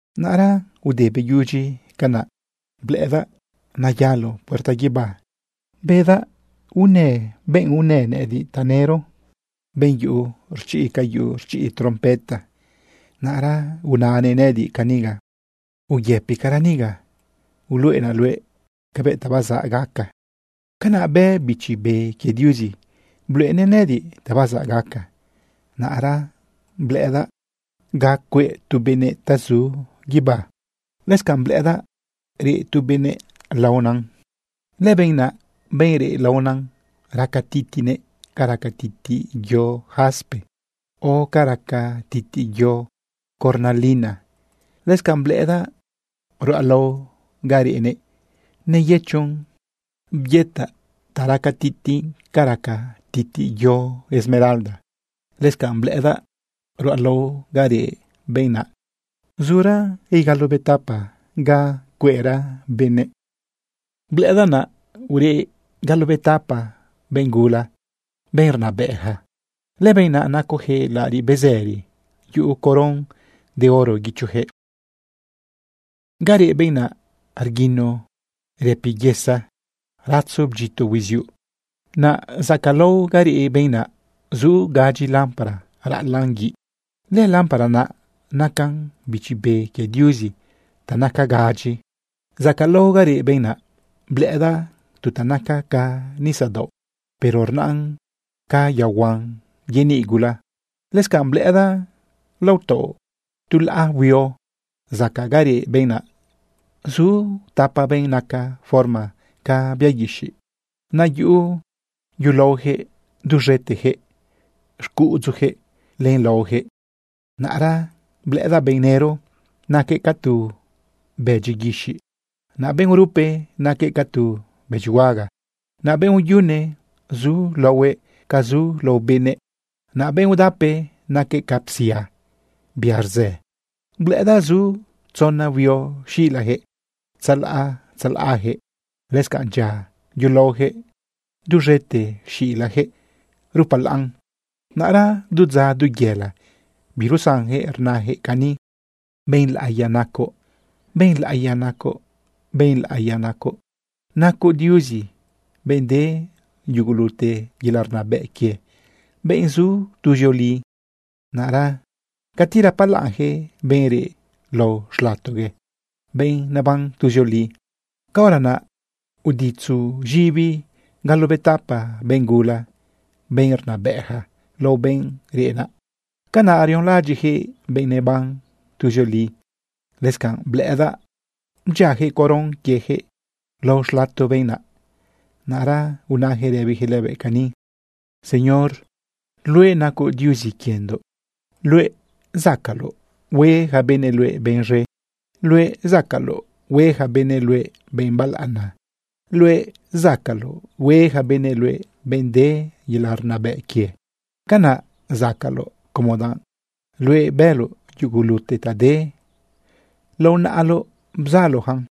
Naꞌra ude beyudyi canaꞌ, blëꞌëdaꞌ neyalo puerta guibá bedaꞌ unë benꞌ unë nëꞌëdiꞌ tanëro, benꞌ yuꞌu rchiꞌ ca yuꞌu rchiꞌ trompeta. Naꞌra unanëꞌ nëꞌëdiꞌ caniga: ―Uyëpicara niga. Uluꞌenaꞌ luëꞌ cabëꞌ ta bazaꞌ gaca. Canaꞌ bë Bichi Be quie Diuzi bluꞌenëꞌ nëꞌëdiꞌ ta bazaꞌ gaca. Naꞌra blëꞌëdaꞌ ga cueꞌ tu benëꞌ ta zu guibá. Lëscanꞌ blëꞌëdaꞌ reꞌ tu benëꞌ laonan. Lëbenꞌ naꞌ, benꞌ reꞌ laonan, raca titiꞌnëꞌ ca raca titiꞌ yo jaspe o ca raca titiꞌ yo cornalina. Lëscanꞌ blëꞌëdaꞌ ruꞌalao ga reꞌnëꞌ, neyëchon byetaꞌ ta raca titiꞌn ca raca titiꞌ yo esmeralda. Lëscanꞌ blëꞌëdaꞌ ruꞌalao ga reꞌ benꞌ naꞌ, zura igalobetapa ga cueꞌra benëꞌ. Blëꞌëdaꞌ naꞌ ureꞌ galobetapa benꞌ gula, benꞌ rnabëꞌja. Lëbenꞌ naꞌ nacojëꞌ laꞌariꞌ bezëri, yuꞌu coron de oro guichojëꞌ. Ga reꞌ benꞌ naꞌ, rguino rëpiyesa, ratzo bdyito huiziuꞌ. Naꞌ zacaꞌlao ga reꞌ benꞌ naꞌ, zu gadyi lámpara raꞌalaꞌn guiꞌ. Lëlámpara naꞌ nacan bichi be quie Diuzi ta naca gadyi. Zacaꞌlao ga reꞌ benꞌ naꞌ, blëꞌëdaꞌ tu ta naca ca nisadaoꞌ, pero rnaꞌn ca yaohuan yeniꞌ gula. Lëscanꞌ blëꞌëdaꞌ lao taoꞌ tu laꞌa huio, zacaꞌ ga reꞌ benꞌ naꞌ, zu tapa benꞌ naca forma ca bia guixiꞌ. Naꞌ yuꞌu yulaojëꞌ duz̃etejëꞌ xcuꞌudzujëꞌ len laojëꞌ. Naꞌra blëꞌëdaꞌ benꞌ nëro, naquëꞌ ca tu bëdyi guixiꞌ, naꞌ benꞌ urupe, naquëꞌ ca tu bëdyihuaga, naꞌ benꞌ uyune, zu laohuëꞌ ca zu lao benëꞌ, naꞌ benꞌ udape, naquëꞌ ca psia bia rzë. Blëꞌëdaꞌ zu tzona huio xilajëꞌ tzalaꞌ tzalaꞌjëꞌ. Lëscanꞌ dyia yulaojëꞌ duz̃ete xilajëꞌ rupalaꞌn. Naꞌra du dza, du yela, birusanjëꞌ rnajëꞌ cani: Benꞌ laꞌiya nacoꞌ, benꞌ laꞌiya nacoꞌ, benꞌ laꞌiya nacoꞌ. Nacoꞌ Diuzi, benꞌ de yugulute yelaꞌ rnabëꞌ quie, benꞌ zu tuzioli. Naꞌra cati rapalaꞌnjëꞌ benꞌ reꞌ lao xlatogue, benꞌ neban tuzioli, caora naꞌ uditzu z̃ibi galobetapa benꞌ gula, benꞌ rnabëꞌja, lao benꞌ reꞌ naꞌ. Canaꞌ rionlaꞌadyiꞌjëꞌ benꞌ neban tuzioli. Lëscanꞌ blëꞌëdaꞌ bdyiajëꞌ coron quiejëꞌ lao xlato benꞌ naꞌ. Naꞌra unajëꞌ rëbijëꞌ lëbëꞌ cani: Señor, luëꞌ nacoꞌ Diuzi quiendoꞌ. Luëꞌ zacaꞌloꞌ hue ja benëꞌ luëꞌ benꞌ z̃e. Luëꞌ zacaꞌloꞌ hue ja benëꞌ luëꞌ benꞌ balaꞌana. Luëꞌ zacaꞌloꞌ hue ja benëꞌ luëꞌ benꞌ de yelaꞌ rnabëꞌ quië. Canaꞌ zacaꞌloꞌ, como danꞌ luëꞌ bëloꞌ yugulute ta de. Lao naꞌaloꞌ bzaloꞌyacan.